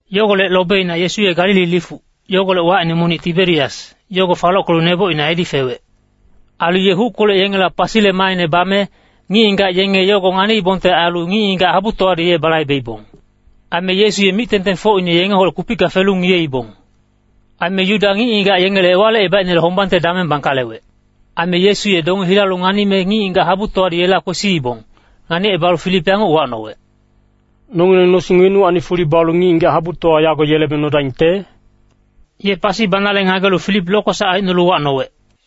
Yogolec lobeina Yesu ye Galili lifuc, yogolec wacine monic Tiberias, yogo falockelu nebocina edi fewec. Ailu ye huckolec yengela pasile maaine bame, ngic-ngigac yenge yogo nganiibongte ailu ngic-ngigac habutowadi ye balaibeibong. Aime Yesu ye mic-tengtengfocine yengeholec kupicka felu ngiyeibong. Aime Yuda ngic-ngigac yengele Ewalicebaicnele hombangte dameng bangkalewec. Aime Yesu ye donge hilalu nganime ngic-ngigac habutowadi yela kwesiibong, nganicebalu Filip yanguc uwacnowec, “Nongileng nosing wenuwacni fuli balu ngic-ngigac habutowa yago yelebeng nodaingte?” Ye pasi banale ngagelu Filip lokwesac aicnolu uwacnowec.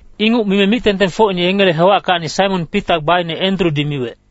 Inguc mime mic-tengtengfocine yengele hewackacni Saimon Pita gbaine Endrudi miwec,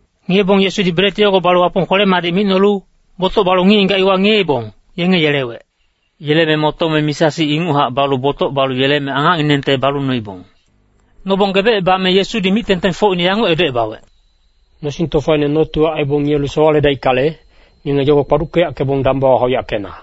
Ngiyebong Yesudi bret yogo balu Wapong kwele-madic micnolu, botoc balu ngic-ngigac iwa ngiyeibong, yenge yelewec. Yeleme motome misa-sic inguchac balu botoc balu yeleme angacnginengte balu noibong. Nobong gebecebame Yesudi mic-tengtengfocine yanguc edocebawec, “Nosing tofaine notiwa aibong ngiyelu sowaledaickale, ngenge yogo kpaduckeyackebong dambawa hauyackena.”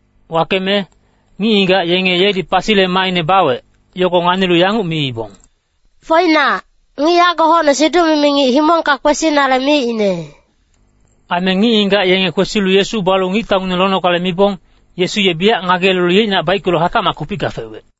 Wakeme, ngic-ngigac yenge yedi pasile maaine bawec, yogo nganilu yanguc miibong, “Foinac, ngic yago hocne siduc-mimi ngic himongka kwesinale miicne.” Aime ngic-ngigac yenge kwesilu Yesu balu ngictaungineng lonogale mibong, Yesu ye biyac ngageyelelu yeicnac baickelu hatacmac kupicka fewec.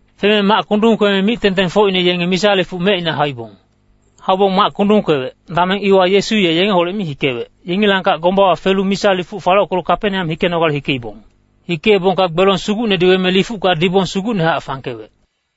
Feme mac kundung kweme mic-tengtengfocine yenge misa lifuc mecina hauibong. Haubong mac kundung kwewec, dameng iwa Yesu ye yengeholec mi hikewec, yengilangkac gombawa felu misa lifuc falockelu Kapeneam hikenogale hikeibong. Hikeebongka gbelong sugucnedi weme lifucka dibong sugucnehac fangkewec.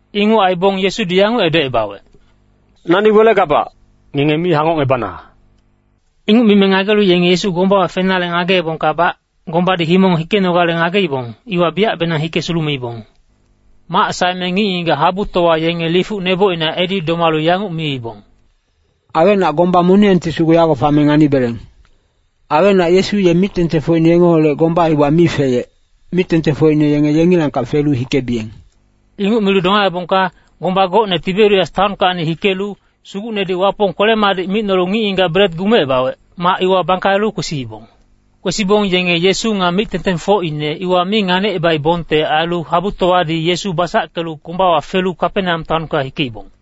Inguc aibong Yesudi yanguc edocebawec, “Nani welegabac. Ngenge mi hangocngebana.” Inguc mime ngagelu yenge Yesu gombawa fenale ngageebongkabac, gombadi himong hikenogale ngageibong, iwa biyacbenang hike sulumeibong. Mac saeme ngic-ngigac habutowa yenge lifuc nebocina edi domalu yanguc miibong, “Awecnac gomba moniyangti sugu yago fame nganibeleng. Aime Yesu ye mic-tengtengfocine yengeholec gomba iwa mi feyec, mic-tengtengfocine yenge yengilangkac felu hikebiyeng.” Inguc milu domaebongka, gomba gocne Tiberias taonkacni hikelu, Sugucnedi Wapong kwele-madic micnolu ngic-ngigac bret gumecebawec, mac iwa bangkalelu kwesiibong. Kwesibong yenge Yesu nga mic-tengtengfocine iwa mi nganicebaibongte ailu habutowadi Yesu basackelu gombawa felu Kapeneam taonka hikeibong.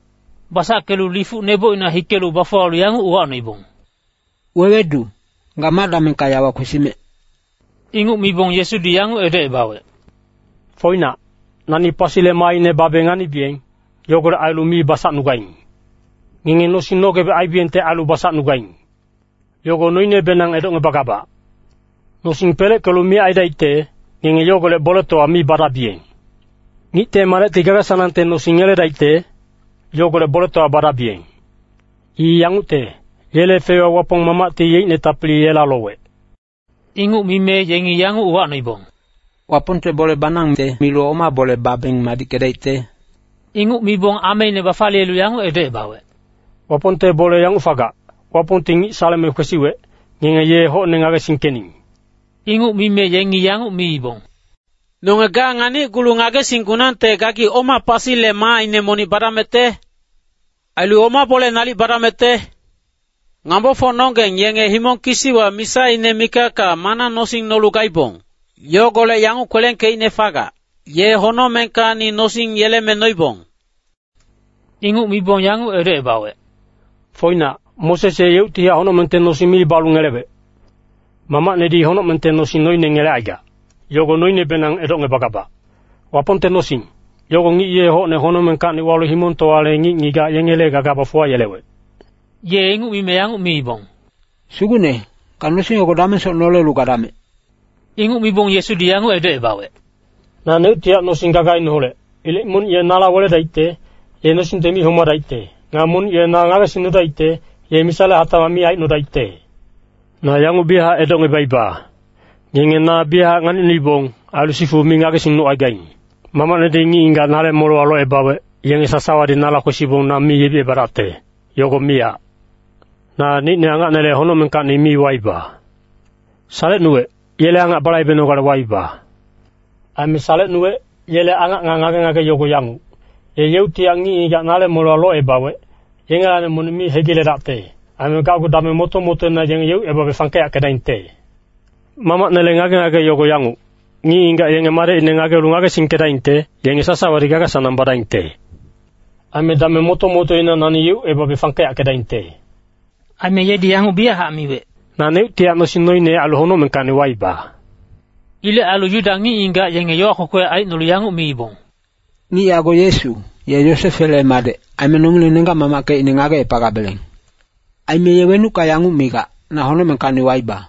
Basackelu lifuc nebocina hikelu bafuwalu yanguc uwacnoibong, “Wewedu, ga ma damengka yawa kwesimec?” Inguc mibong Yesudi yanguc edocebawec, “Foinac, nani pasile maaine babe nganibiyeng, yogolec ailu mi basacnugaing. Ngenge nosing nogebec aibiyengte ailu basacnugaing, yogo noinebenang edocngebagabac. Nosing peleckelu miyac aidaicte, ngenge yogolec boletowa mi badabiyeng. Ngicte Madecti gaga-sanangte nosing ngeledaicte, yogolec boletowa badabiyeng. I yangucte, yele feiwa Wapong Mamacti yeicne tapili yela lowec.” Inguc mime yengi yanguc uwacnoibong, “Wapongte bole banangte milu oma bole babeng madickedaicte?” Inguc mibong ameine bafaliyelu yanguc edocebawec, “Wapongte bole yanguc fagac, Wapongti ngic saleme kwesiwec, ngenge ye hocne ngagesingkening.” Inguc mime yengi yanguc miibong, “Nonge ga nganicgulu ngagesinggunangte gagi oma pasile maaine monic badamecte? Ailu oma bole nalic badamecte? Ngambofocnonggeng yenge himong kisiwa misaine mikacka mana nosing nolu gaibong, yogolec yanguc kwelengkeicne fagac, ‘Ye honocmengkacni nosing yeleme noibong.’” Inguc mibong yanguc edocebawec, “Foinac, Moses ye yeuctihac honocmengte nosing mi balu ngelewec. Mamacnedi honocmengte nosing noine ngelecaigac, yogo noinebenang edocngebagabac. Wapongte nosing, yogo ngic ye hocne honocmengkacni walu himongtowale ngic-ngigac yengele gaga bafuwayelewec.” Ye inguc mime yanguc miibong, “Sugucne, ga nosing yogo damengsoc nolelu gadamec.” Inguc mibong Yesudi yanguc edocebawec, “Naneuctihac nosing gagaineholec. Ilec monic ye nala weledaicte, ye nosingte mi homadaicte. Nga monic ye na ngagesingnudaicte, ye misale hatacmac mi aicnodaicte. Na yanguc biyachac edocngebaiba, ngenge na biyachac nganicnuibong, ailu sifu mi ngagesingnucaigaing. Mamacnedi ngic-ngigac nale molewa locebawec, yenge sasawadi nala kwesibong na mi yebicebadacte, yogo miyac. Naneicne angacnele honocmengkacni mi waiba. Salecnuwec yele angac balaibenogale waiba. Aime salecnuwec, yele angac nga ngage-ngage yogo yanguc, ye yeuctihac ngic-ngigac nale molewa locebawec, yengelacni monic mi hegiledacte. Aime gacgu dameng moto-motoina yenge yeucebabe fangkeyackedaingte. Mamacnele ngage-ngage yogo yanguc, ngic-ngigac yenge Madecine nganilu ngagesingkedaingte, yenge sasawadi gaga-sanang badaingte. Aime dameng moto-motoina nani yeucebabe fangkeyackedaingte.” Aime yedi yanguc biyachac miwec, “Naneuctihac nosing noine ailu honocmengkacni waiba.” Ilec ailu Yuda ngic-ngigac yenge yowa kwekwe aicnolu yanguc miibong, “Ngic yago Yesu, Ye Yosefele madec. Aime nongileng nenggac-mamackecine ngagecepagabeleng. Aime ye wenucka yanguc migac, ‘Na honocmengkacni waiba.’”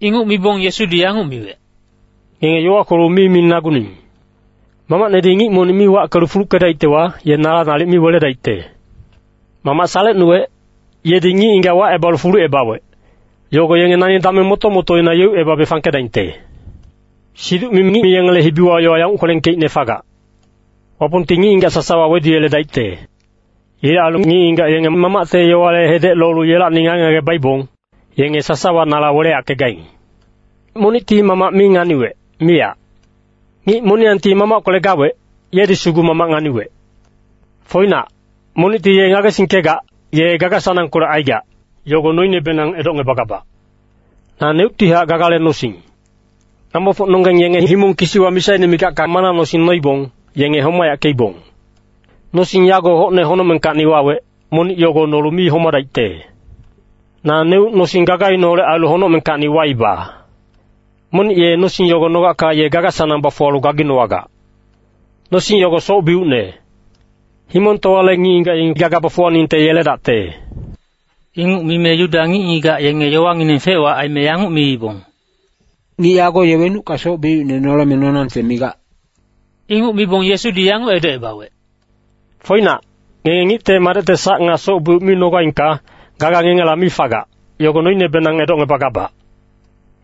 Inguc mibong Yesudi yanguc miwec, “Ngenge yowa kwelu mi minaguning. Mamacnedi ngic monic mi wackelu fuluckedaictewa, ye nala nalic mi weledaicte. Mamac salecnuwec, yedi ngic-ngigac wacebalu fulucebawec, yogo yenge nani dameng moto-motoina yeucebabe fangkedaingte. “Siduc-mimi ngic yengele hibiwa yowa yanguc kwelengkeicne fagac, ‘Wapongti ngic-ngigac sasawa weduyeledaicte.’ Ilec ailu ngic-ngigac yenge Mamacte yowale hedec lolu yelacni ngage-ngage baibong, yenge sasawa nala weleyackegaing. Monicti Mamac mi nganiwec, miyac. Ngic moniyangti Wapongkolec gawec, yedi sugu Mamac nganiwec. Foinac, monicti ye ngagesingkegac, ye gaga-sanangkolec aigac, yogo noinebenang edocngebagabac. “Naneuctihac gagale nosing. Ngambofocnonggeng yenge himong kisiwa misaine mikacka mana nosing noibong, yenge homayackeibong. Nosing yago hocne honocmengkacni wawec, monic yogo nolu mi homadaicte. Naneuc nosing gagaineholec ailu honocmengkacni waiba. Monic ye nosing yogo nogacka ye gaga-sanang bafuwalu gaginowagac. Nosing yogo soc-biucne. Himongtowale ngic-ngigac yengi gaga bafuwaningte yeledacte.” Inguc mime Yuda ngic-ngigac yenge yowangineng fec-wac aime yanguc miibong, “Ngic yago ye wenucka soc-biucine noleme nonangte migac?” Inguc mibong Yesudi yanguc edocebawec, “Foinac, ngenge Ngicte Madecte sac nga soc-biuc mi nogaingka, gaga ngengela mi fagac, yogo noinebenang edocngebagabac.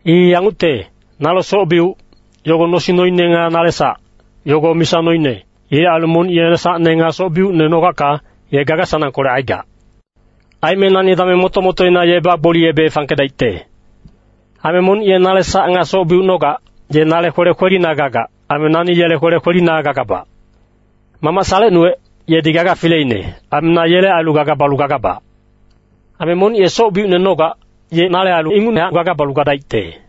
I yangucte, nale soc-biuc, yogo nosing noine nga nale sac, yogo misa noine. Ilec ailu monic ye sacne nga soc-biucne nogacka, ye gaga-sanangkolec aigac. Aime nani dameng moto-motoina ye bagboliyebe fangkedaicte. Aime monic ye nale sac nga soc-biuc nogac, ye nale kwele kwelina gagac. Aime nani yele kwele kwelina gagabac. Mamac salecnuwec, yedi gaga fileine. Aime na yele ailu gaga balu gagabac. Aime monic ye soc-biucne nogac, ye nale ailu inguchac gaga balu gadaicte.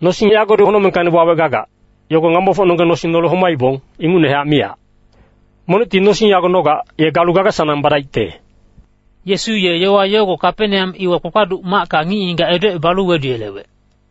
Nosing yagodi honocmengkacni wawec gagac, yogo ngambofocnonggeng nosing nolu homaibong, ingucnehac miyac. Monicti nosing yago nogac, ye galu gaga-sanang badaicte.” Yesu ye yowa yogo Kapeneam iwa kpakpaduc macka ngic-ngigac edocebalu weduyelewec.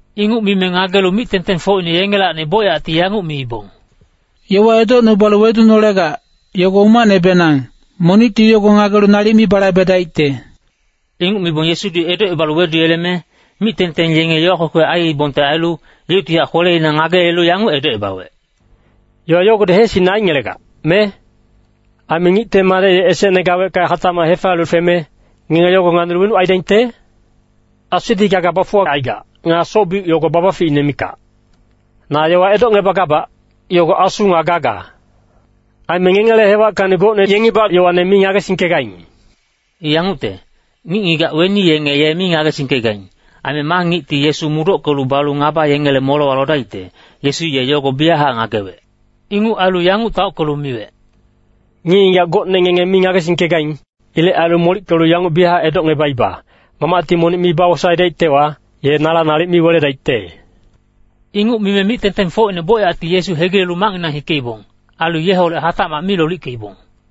Inguc mime ngagelu mic-tengtengfocine yengelacni bocyacti yanguc miibong, “Yowa edocnubalu wedunolegac, yogo umacnebenang, monicti yogo ngagelu nalic mi balaibedaicte.” Inguc mibong Yesudi edocebalu weduyeleme, mic-tengteng yenge yowa kwekwe aiibongte ailu, yeuctihac kweleina ngageyelelu yanguc edocebawec, “Yowa yogodi heesicne aingelegac, me? Aime Ngicte Madec ye esecne gawecka hatacmac hefaliye feme, ngenge yogo nganilu wenuc aidaingte? Asudi gaga bafuwacaigac. Nga soc-biuc yogo babaficine mikac. Na yowa edocngebagabac, yogo asu nga gaga. Aime ngengele hewackacni gocne yengibac yowane mi ngagesingkegaing.” I yangucte, ngic-ngigac weni yenge ye mi ngagesingkegaing. Aime ma ngicti Yesu mudockelu balu ngaba yengele molewa lodaicte, Yesu ye yogo biyachac ngagewec. Inguc ailu yanguc taockelu miwec, “Ngic-ngigac gocne ngenge mi ngagesingkegaing. Ilec ailu molickelu yanguc biyachac edocngebaiba, Mamacti monic mi bawosaedaictewa, ye nala nalic mi weledaicte.” Inguc mime mic-tengtengfocine bocyacti Yesu hegilelu macnginang hikeibong, ailu yeholec hatacmac mi lolickeibong.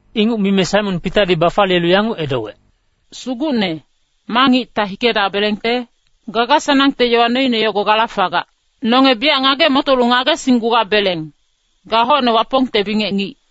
Inguc mime Saimon Pitadi bafaliyelu yanguc edowec, “Sugucne, ma ngicta hikedabelengte? Gaga-sanangte yowa noine yogo gala fagac. Nonge biyac ngage-motolu ngagesinggugabeleng, ga hocne Wapongte bingec ngic.”